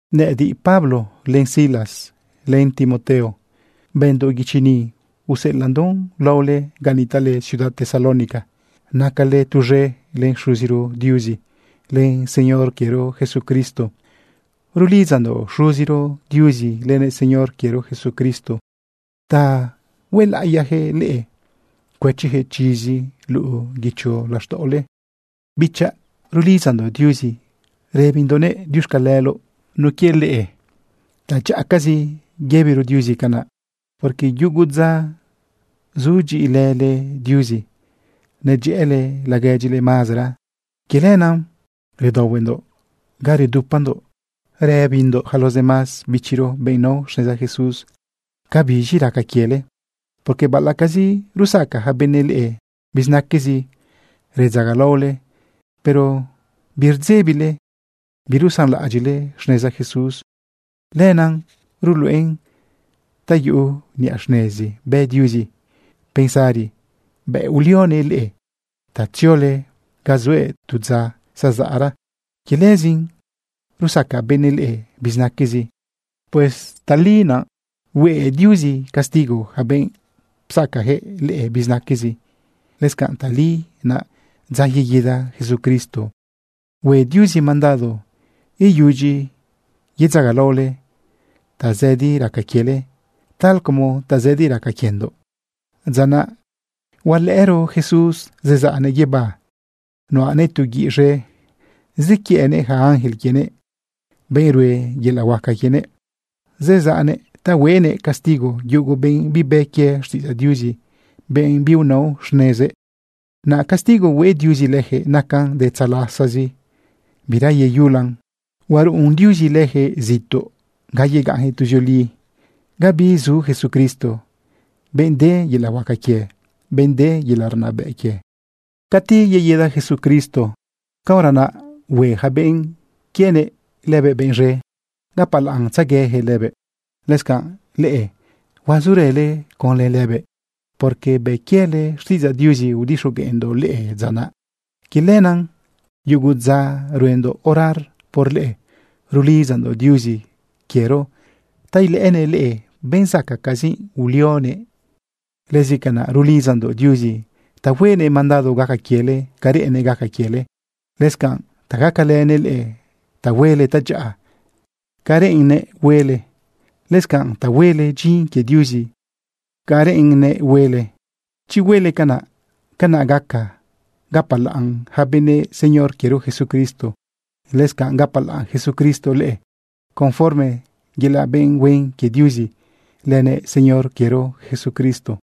Nëꞌëdiꞌ, Pablo, len Silas, len Timoteo, bëndoꞌ guichi ni, useꞌelaꞌndoꞌn laole ga nitaꞌle ciudad Tesalónica. Nacale tuz̃e len Xuziro Diuzi len Señor quiero Jesucristo. Rulidzandoꞌ Xuziro Diuzi lënëꞌ Señor quiero Jesucristo ta huelaꞌiyaquëꞌ leꞌe cuëchiyaquëꞌ chizi luꞌu guicho laxtaꞌole. Bichaꞌ, rulidzandoꞌ Diuzi rëbindoꞌnëꞌ diuxcaleloꞌ por leꞌe. Tadyaꞌacazi yëbiro Diuzi canaꞌ, porque yugo dza zudyiꞌilële Diuzi, nedyëꞌële laguedyile mazara. Quie lenaꞌ redaohuendoꞌ ga redupandoꞌ yëbindoꞌ yaca los demás bichiro, benꞌ nao xneza Jesús, cabiz̃i raca quiele, porque baꞌalaꞌcazi rusaca yaca benëꞌ leꞌe bizinaquezi redzagalaole, pero birdzebile birusanlaꞌadyiꞌle xneza Jesús. Lenaꞌ ruluꞌen ta yuꞌu niꞌa xnezi bë Diuzi pensari bëꞌ ulionëꞌ leꞌe ta tziole ga zuëꞌ tu dza zazaꞌra. Quie lëzin rusaca benëꞌ leꞌe bizinaquezi. Pues tali naꞌ hue Diuzi castigo yaca benꞌ psacayaquëꞌ leꞌe bizinaquezi. Lëscanꞌ tali naꞌ dza yeguida Jesucristo hue Diuzi mandado ta iyudyi yedzagalaole tazëdi raca quiele tal como tazëdi raca quiendoꞌ. Dza naꞌ huelëꞌëro Jesús zezaꞌnë guibá, nuꞌanëꞌ tu guiꞌ z̃e, zequiëꞌnëꞌ yaca ángel quienëꞌ, benꞌ rue yelaꞌ huaca quienëꞌ. Zezaꞌnëꞌ ta huenëꞌ castigo yugo benꞌ bibë quie xtiꞌidzaꞌ Diuzi, benꞌ biunao xnezëꞌ. Naꞌ castigo hue Diuzi leyaquëꞌ nacan de tzalasazi, bira yeyulan. Huaruꞌun Diuzi lëjëꞌ zituꞌ ga yegaꞌnyaquëꞌ tuzioli, ga bizu Jesucristo, benꞌ de yelaꞌ huaca quie, benꞌ de yelaꞌ rnabëꞌ quie. Cati yeguida Jesucristo, caora naꞌ hue yaca benꞌ quienëꞌ lëbëꞌ benꞌ z̃e, gapalaꞌntzegueyaquëꞌ lëbëꞌ. Lëscanꞌ, leꞌe, huazurële conlë lëbëꞌ, porque bë quiele xtiꞌidzaꞌ Diuzi udixogueꞌndoꞌ leꞌe dza naꞌ. Quie lenaꞌ yugo dza ruendoꞌ orar por leꞌe rulidzandoꞌ Diuzi quiero ta ilëꞌënëꞌ leꞌe benꞌ zacaꞌcazi ulionëꞌ leꞌe. Lëscanꞌ rulidzandoꞌ Diuzi ta huenëꞌ mandado gaca quiele ca reꞌennëꞌ gaca quiele, lëscanꞌ ta gacalënëꞌ leꞌe ta huele tadyaꞌa ca reꞌenle huele, lëscanꞌ ta huele dyin quie Diuzi ca reꞌenle huele. Chi huele canaꞌ, canaꞌ gaca gapalaꞌn yaca benëꞌ Señor quiero Jesucristo. Lëscanꞌ gapalaꞌn Jesucristo leꞌe conforme yelaꞌ benꞌ huen quie Diuzi lënëꞌ Señor quiero Jesucristo.